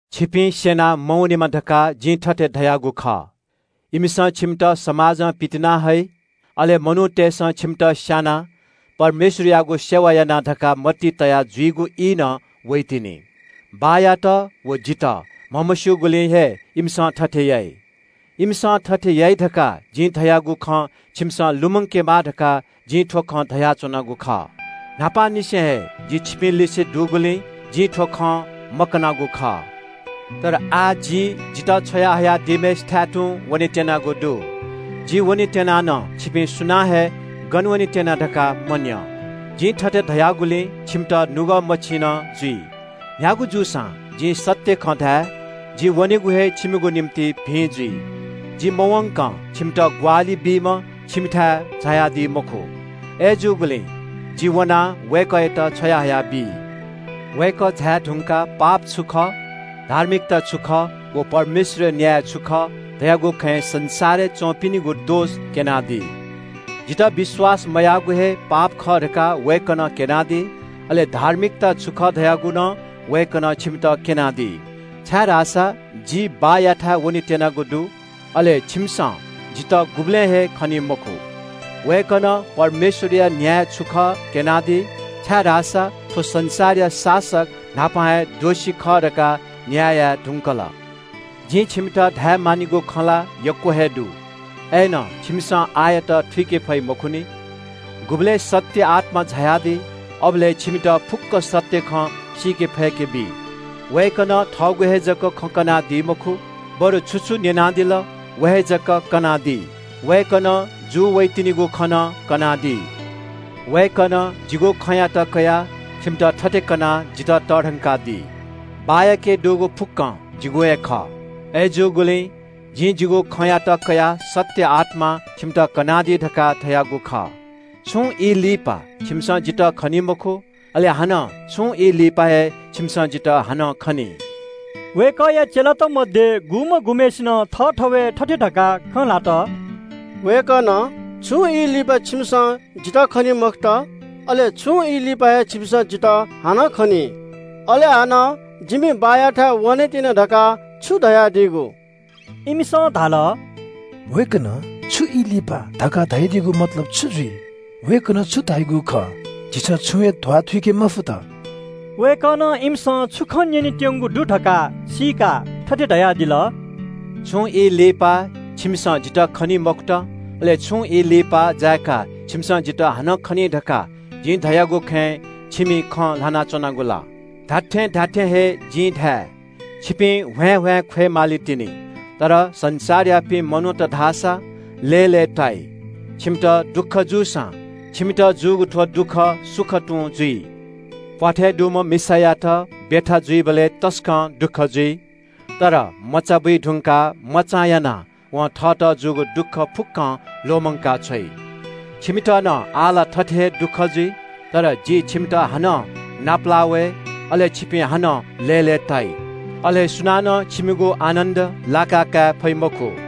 “छिपिं स्‍यना मवनेमा धकाः जिं थथे धयागु खः। इमिसं छिमित धर्मशास्‍त्र स्‍यनीगु छेँनं पितिनाहइ। अले मनूतय्‌सं छिमित स्‍यानाः परमेश्‍वरयागु सेवा याना धकाः मतिइ तया जुइगु ई नं वइतिनि। बाःयात व जितः म्‍हमस्‍यूगुलिं हे इमिसं थथे याइ। इमिसं थथे याइ धकाः जिं धयागु खँ छिमिसं लुमंकेमा धकाः जिं थ्‍व खँ धयाच्‍वनागु खः। न्‍हापांनिसें हे जि छिपिंलिसे दुगुलिं जिं थ्‍व खँ मकनागु खः।” “अय्‌नं आः जि जितः छ्वया हयादीम्‍हय्‌सिथाय् तुं वनेत्‍यनागु दु। जि वनेत्‍यना नं छिपिं सुनानं हे ‘गन वनेत्‍यना’ धकाः मन्‍यं। जिं थथे धयागुलिं छिमित नुगः मछिन जुइ। न्‍ह्यागु जूसां जिं सत्‍य खँ धाये, जि वनेगु हे छिमिगु निंतिं भिं जुइ। जि मवंकं छिमित ग्‍वाहालि बीम्‍ह छिमिथाय् झायादी मखु। अय्‌जूगुलिं जिं वनाः वय्‌कःयात छ्वयाहया बी। वय्‌कः झाये धुंकाः पाप छु खः, धार्मिकता छु खः व परमेश्‍वरया न्‍याय छु खः धयागु खँय् संसारय् च्‍वंपिनिगु दोष क्‍यनादी। जितः विश्‍वास मयाःगु हे पाप खः धकाः वय्‌कलं इमित क्‍यनादी। अले धार्मिकता छु खः धयागु नं वय्‌कलं छिमित क्‍यनादी, छाय्‌धाःसा जि बाःयाथाय् वनेत्‍यनागु दु। अले छिमिसं जितः गुबलें हे खनी मखु। वय्‌कलं परमेश्‍वरया न्‍याय छु खः क्‍यनादी, छाय्‌धाःसा थ्‍व संसारया शासक न्‍हापा हे दोषी खः धकाः न्‍याय याये धुंकल।” “जिं छिमित धायेमानिगु खँ ला यक्‍व हे दु। अय्‌नं छिमिसं आःयात थुइके फइ मखुनि। गुबलय् सत्‍य आत्‍मा झायादी, अबलय् छिमित फुक्‍क सत्‍य खँ सीके फय्‌के बी। वय्‌कलं थःगु हे जक खँ कनादी मखु, बरु छु छु न्‍यनादिल व हे जक कनादी। वय्‌कलं लिपा जूवइतिनिगु खँ नं कनादी। वय्‌कलं जिगु खँयात कयाः छिमित थथे कनाः जितः तःधंकादी। बाःयाके दुगु फुक्‍कं जिगु हे खः। अय्‌जूगुलिं जिं जिगु खँयात कयाः सत्‍य आत्‍मां छिमित कनादी धकाः धयागु खः।” “छुं ई लिपा छिमिसं जितः खनी मखु, अले छुं ई लिपा हे छिमिसं जितः हानं खनी।” वय्‌कःया चेलात मध्‍ये गुम्‍ह गुम्‍हय्‌सिनं थःथवय् थथे धकाः खँ ल्‍हात – “वय्‌कलं – ‘छुं ई लिपा छिमिसं जितः खनी मखुत,’ अले ‘छुं ई लिपा हे छिमिसं जितः हानं खनी,’ अले हानं – ‘जिमि बाःयाथाय् वनेत्‍यना’ धकाः छु धयादीगु?” इमिसं धाल – “वय्‌कलं – ‘छुं ई लिपा’ धकाः धयादीगु मतलब छु जुइ? वय्‌कलं छु धयादीगु खः झीसं छुं हे ध्‍वाथुइके मफुत।” वय्‌कलं इमिसं छुं खँ न्‍यनेत्‍यंगु दु धकाः सीकाः थथे धयादिल – “छुं ई लिपा छिमिसं जितः खनी मखुत, अले छुं ई लिपा छिमिसं जितः हानं खनी धकाः जिं धयागु खँय् छिमि थःथवय् खँ ल्‍हाना च्‍वनागु ला? जिं छिमित खःगु खँ धाये – छिपिं ह्वाँय्‌ह्वाँय् ख्‍वय् मालीतिनि, संसारयापिं मनूत धाःसा लय्‌लय्‌ताइ। छिमित दुःख जूसां, छिमित जूगु थ्‍व दुःख सुखय् हिलावनी। प्‍वाथय् दुम्‍ह मिसायात ब्‍यथा जुइबलय् तसकं दुःख जुइ, तर मचा बुइधुंकाः मचां यानाः वं थःत जूगु दुःख फुक्‍कं ल्‍वःमंका छ्वइ। छिमित नं आः थथे हे दुःख ला जुइ। तर जि छिमित हानं नापलाः वये, अले छिपिं हानं लय्‌लय्‌ताइ। अले सुनानं छिमिगु आनन्‍द लाकाकाये फइ मखु।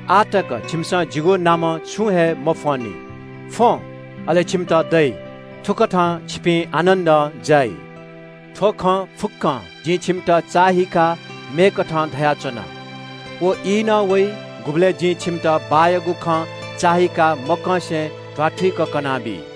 आः तक छिमिसं जिगु नामं छुं हे मफ्‍वंनि। फ्‍वँ, अले छिमित दइ, थुकथं छिपिं आनन्‍दं जाइ।” “थ्‍व खँ फुक्‍कं जिं छिमित चाःहिकाः मेकथं धयाच्‍वना। व ई नं वइ गुबलय् जिं छिमित बाःयागु खँ चाःहिकाः मकंसे ध्‍वाथुइक कनाबी।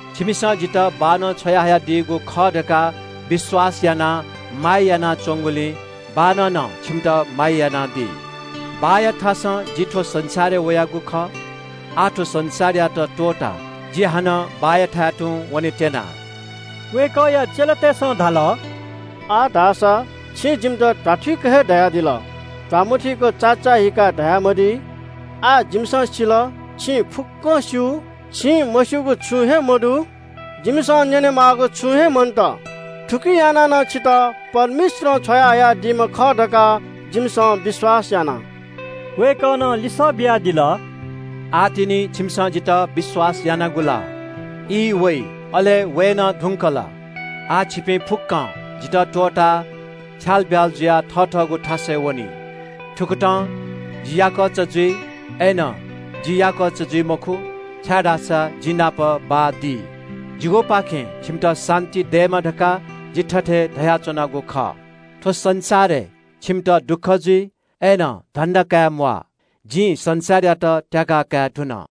छिमिसं जितः बाःनं छ्वयाहयादीगु खः धकाः विश्‍वास यानाः जितः माया यानाच्‍वंगुलिं बाःनं नं छिमित माया यानादी। बाःया थासं जि थ्‍व संसारय् वयागु खः। आः थ्‍व संसारयात त्‍वःताः जि हानं बाःयाथाय् तुं लिहां वनेत्‍यना।” वय्‌कःया चेलातय्‌सं धाल – “आः धाःसा छिं जिमित ध्‍वाथुइक हे धयादिल। ध्‍वामथुइक चाचाःहीकाः धयामदी। आः जिमिसं सिल, छिं फुक्‍कं स्‍यू, छिं मस्‍यूगु छुं हे मदु। जिमिसं न्‍यनेमाःगु छुं हे मन्‍त। थुकिं यानाः नं छितः परमेश्‍वरं छ्वयाहयादीम्‍ह खः धकाः जिमिसं विश्‍वास याना।” वय्‌कलं लिसः बियादिल – “आः तिनि छिमिसं जितः विश्‍वास यानागु ला? ई वइ, अले वये नं धुंकल, आः छिपिं फुक्‍कं जितः त्‍वःताः छ्यालब्‍याल जुयाः थथःगु थासय् वनी। थुकथं जि याकःचा जुइ, अय्‌नं जि याकःचा जुइ मखु, छाय्‌धाःसा जि नाप बाः दी। जिगुपाखें छिमित शान्‍ति दयेमा धकाः जिं थथे धयाच्‍वनागु खः। थ्‍व संसारय् छिमित दुःख जुइ, अय्‌नं साहस या, जिं संसारयात त्‍याके धुन।”